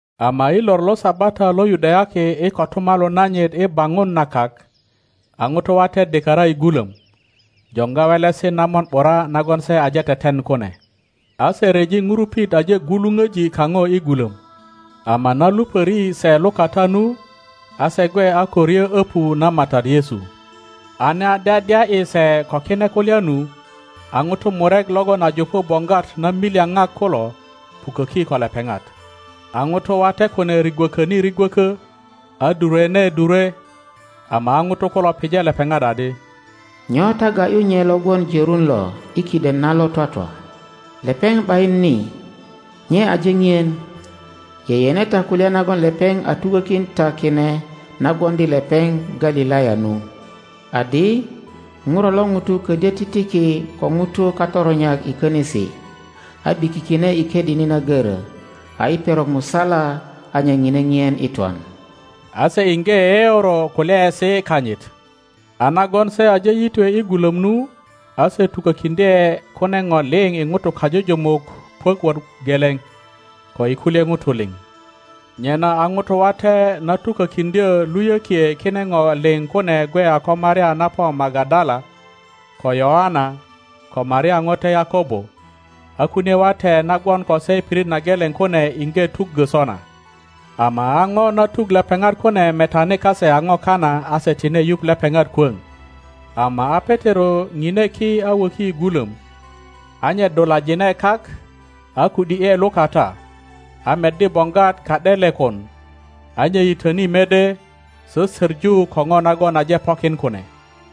Ama i lor lo Sabata lo Yudayaki i kotumalu nanyit i baŋun na kak, a ŋutu wate dikara i gulom, joŋga welesi na mon ’bura nagon se aje teten kune. A se ryeji ŋurupit aje gwuluŋöji kaŋo i gulöm, ama na lupöri se lukata nu, a se gwe a ko ryo öpu na MATAT Yesu. A na dyadya ’yi se ko kine kulya nu, a ŋutu murek logon a jupu boŋgwat namilyaŋak kulo, puköki ko lepeŋat. A ŋutu wate kune rigwököni rigwökö, a durwene durwe, ama a ŋutu kulo pije lepeŋat adi, Nyo ta ga ’yu nye lo gwon jörun lo i kiden na lo twatwa? Lepeŋ ’bayin ni; nye aje ŋien. Yeyene ta kulya nagon lepeŋ a tukökin ta kine na gwoŋdi lepeŋ Galilaya nu, adi, Ŋuro lo ŋuto kodyö titiki ko ŋutu katoronyak i könisi, a ’bikikine i ködini na goro, a i perok musala a nye ŋine ŋien i twan. A se iŋge yeyeoro kulyaesi kanyit. a nagon se aje yitwe i gulöm nu, a se tukökiŋdye kune ŋo liŋ i ŋutu kajujumuk puök wot geleŋ, ko i kulye ŋutu liŋ. Nyena a ŋutu wate na tukökiŋdyö luyökie kine ŋo liŋ kune gwe a ko Maria na po Magadala, ko Yöana, ko Maria ŋote Yakobo; a kunie wate na gwon ko se i pirit na geleŋ kune iŋge tuggö sona. Ama a ŋo na tuk lepeŋat kune metani kase a ŋo kana a se tine yuŋ lepeŋat kwöŋ. Ama a Petero ŋine ki a woki i gulöm, a nye dulajine kak, a ku ’di ’e lukata, a meddi boŋgwat ka ’delekon, a nye yitöni mede, sösöŋu ko ŋo nagon aje pokin kune.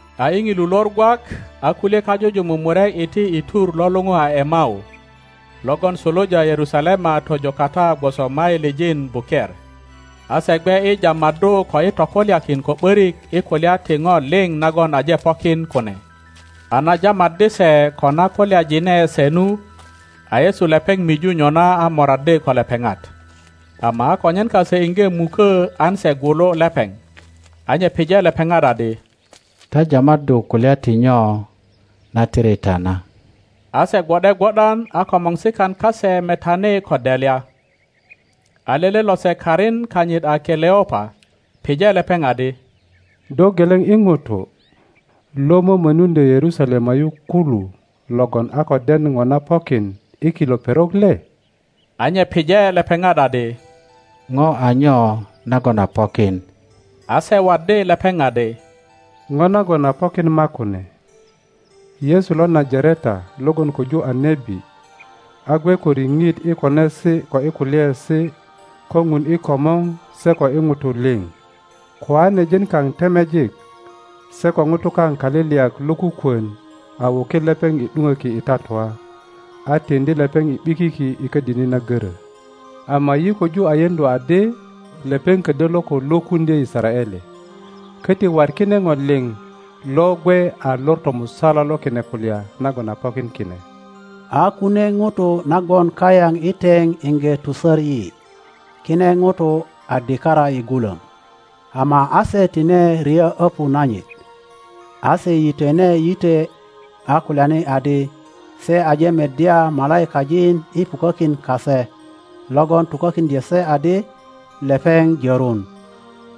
A i ŋilu lor gwak, a kulye kajujumuk murek iti i tur lo luŋu a Emau, logon suluja Yerusalema tojo kata gwoso mailijin buker, a se gwe i jamaddu ko i tokulyakin ko ’börik i kulya ti ŋo liŋ nagon aje pokin kune. A na jamaddi se ko na kulyajine se nu, a Yesu lepeŋ miju nyona a moraddi ko lepeŋat; ama a konyen kase iŋge muko an se gwulu lepeŋ. A nye pije lepeŋat adi, Ta jamaddu kulya ti nyo na tiri ta na? A se gwo ’de gwo ’dan a komorsikan kase metani ko delya. a lele lose karin kanyit a Keleopa, pije lepeŋ adi, Do geleŋ i ŋutu, lo mömönuŋdyo Yerusalema yu kulu logon a ko den ŋo na pokin i kilo perok le? A nye pije lepeŋat adi, Ŋo a nyo nagon a pokin? A se waddi lepeŋ adi, Ŋo nagon a pokin makune: Yesu lo Najareta logon koju a nebi, a gwe ko riŋit i konesi ko i kulyaesi ko Ŋun i komor se ko i ŋutu liŋ, koanejin kaŋ temejik se ko ŋutu kaŋ kaliliyak lokukwon a wukin lepeŋ i ’duŋöki i tatua, a tiŋdi lepeŋ i ’bikiki i ködini na görö. Ama yi köju a yeŋdu adi lepeŋ ködyö lo ko lwökuŋdyö Yisaraele. Köti wat kine ŋo liŋ lo gwe a lor tomusala lo kine kulya nagon a pokin kine. A kunie ŋutu na gwon kayaŋ i teŋ iŋge tusör yi. Kine ŋutu a dikara i gulöm, ama a se tine ryö öpu nanyit, a se yitwene yitwe a kulyani adi, se aje meddya malaikajin i pukökin kase, logon tukökiŋdyö se adi, lepeŋ jörun.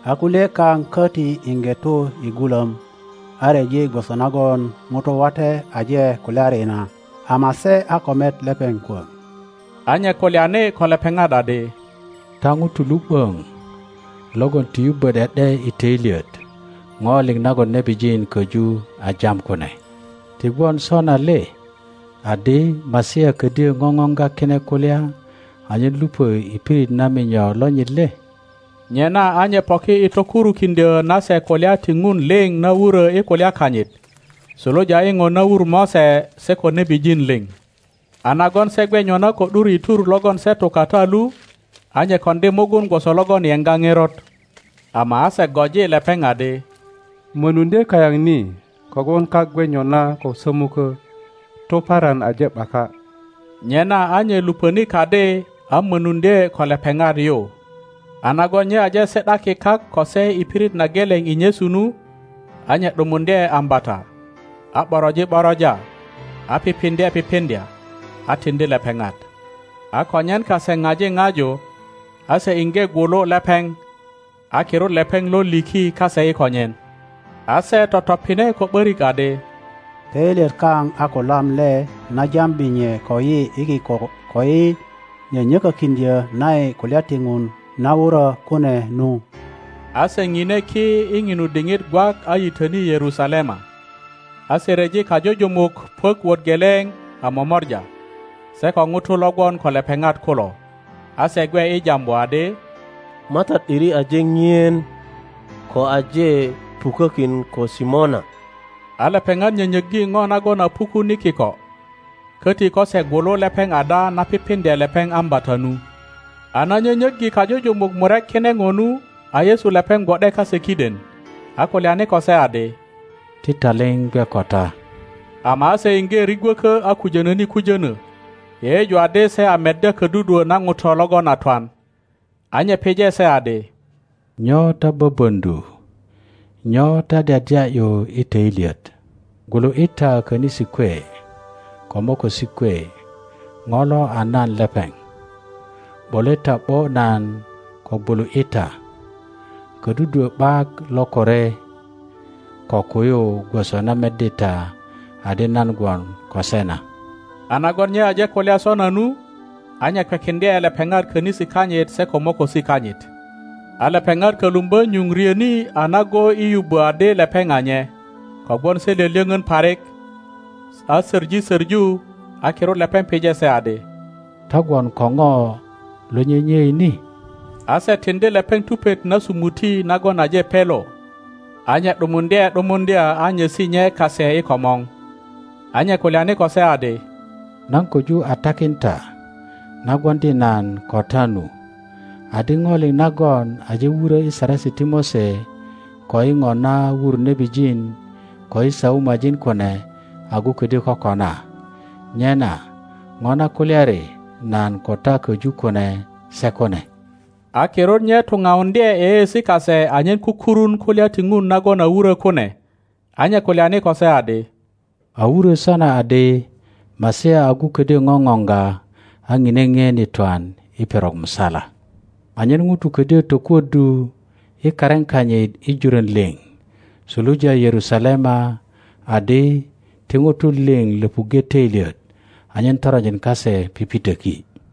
A kulye kaŋ köti iŋge tu i gulom, a ryeji gwoso nagon ŋutu wate aje kulyari na, ama se a ko met lepeŋ kwöŋ. a nye kulyani ko lepeŋat adi, Ta ŋutu lu ’böŋ logon ti yubbö ’de ’de i toilyet ŋo liŋ nagon nebijin koju a jam kune! Ti gwon sona le adi, Masia ködyö ŋoŋoŋga kine kulya anyen lupö i pirit na minyo lonyit le? Nyena a nye poki i tokurukiŋdyö na se kulya ti Ŋun liŋ na wurö i kulya kanyit, suluja i ŋo na wur Mose se ko nebijin liŋ. A nagon se gwe nyona ko ’dur i tur logon se tu kata lu, a nye koŋdi mugun gwoso logon yeŋga ŋerot. Ama a se goji lepeŋ adi, Mönuŋdye kayaŋ ni kogwon kak gwe nyona ko sömukö, tuparan aje ’baka. Nyena a nye luponi kadi a mönuŋdye ko lepeŋat yu. A nagon nye aje si ’daki kak ko se i pirit na geleŋ i nyesu nu, a nye ’dumuŋdye ambata, a ’boroji ’boroja, a pipiŋdye pipiŋdya, a tiŋdi lepeŋat. A konyen kase ŋaji ŋaju, a se iŋge gwulu lepeŋ; a kirut lepeŋ lo liki kase i konyen. a se totopine ko ’börik adi, Töilyet kaŋ a kolam le na jambi nye koyi i kiko ko i nyönyökökiŋdyö na yi kulya ti Ŋun na wurö kune nu? a se ŋine ki i ŋinu diŋit gwak a yitöni Yerusalema; a se ryeji kajujumuk puök wot geleŋ a momora, se ko ŋutu lo gwon ko lepeŋat kulo, a se gwe i jambu adi, MATAT ’diri aje ŋien, ko aje pukökin ko Simona! a lepeŋat nyönyöggi ŋo nagon a pukun i kiko, köti ko se gwulu lepeŋ ada na pipiŋdye lepeŋ ambata nu. A na nyönyöggi kajujumuk murek kine ŋo nu, a Yesu lepeŋ gwo ’de kase kiden, a kulyani ko se adi, Ti taliŋ gwe ko ta! Ama a se iŋge rigwöko a kujönöni kujönö, yeyeju adi se a meddya ködudwö na ŋuto logon a twan. A nye pije se adi, Nyo ta böböŋdu? Nyo ta dyadya ’yu i töilyet? Gwulu ’yi ta könisi kwe ko mokosi kwe, ŋo lo a nan lepeŋ. ’Bole ta ’bo nan ko gwulu ’yi ta. Ködudwö ’bak lokore ko kuyu gwoso na meddi ta adi nan gwon ko se na. a nagon nye aje kulya sona nu, a nye kwekiŋdye lepeŋat könisi kanyit se ko mokosi kanyit. A lepeŋat kölumbö nyuŋ ryoni a nago i yubbo adi lepeŋ a nye, kogwon se lyölyöŋön parik, a soŋi soŋu, a kirut lepeŋ pije se adi, Ta gwon ko ŋo lo nyenyei ni? A se tiŋdi lepeŋ tupet na sumuti nagon aje pelo. a nye ’dumuŋdye ’dumuŋdya a nyesi nye kase i komor. A nye kulyani ko se adi, Nan koju a takin ta na gwoŋdi nan ko ta nu, adi, ŋo liŋ nagon aje wurö i Saresi ti Mose, ko i ŋo na wur nebijin ko i Saumajin kune agu ködyö kokona, nyena ŋo na kulyari nan ko ta köju kune sekune. A kirut nye tuŋauŋdye yeyeesi kase anyen kukurun kulya ti Ŋun nagon a wuro kune; a nye kulyani ko se adi, A wuro sona adi, Masia agu ködyö ŋoŋoŋga, a ŋine ŋien i twan i perok musala, anyen ŋutu ködyo tokuoddu i karin kanyit i jurön liŋ suluja Yerusalema adi, ti ŋutu liŋ löpuŋge toilyet anyen toronjin kase pipitoki.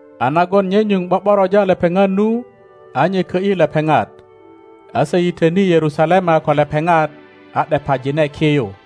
A nagon nye nyuŋ ’bo ’boroja lepeŋat nu, a nye kö ’yi na lepeŋ, a se yitöni Yerusalema ko lepeŋat a ’depajine ki yu.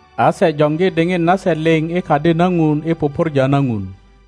a se joŋgi diŋit nasekiŋdye komorsikan kase kak i twoju liŋ i Kadi na Ŋun i pupurja na Ŋun.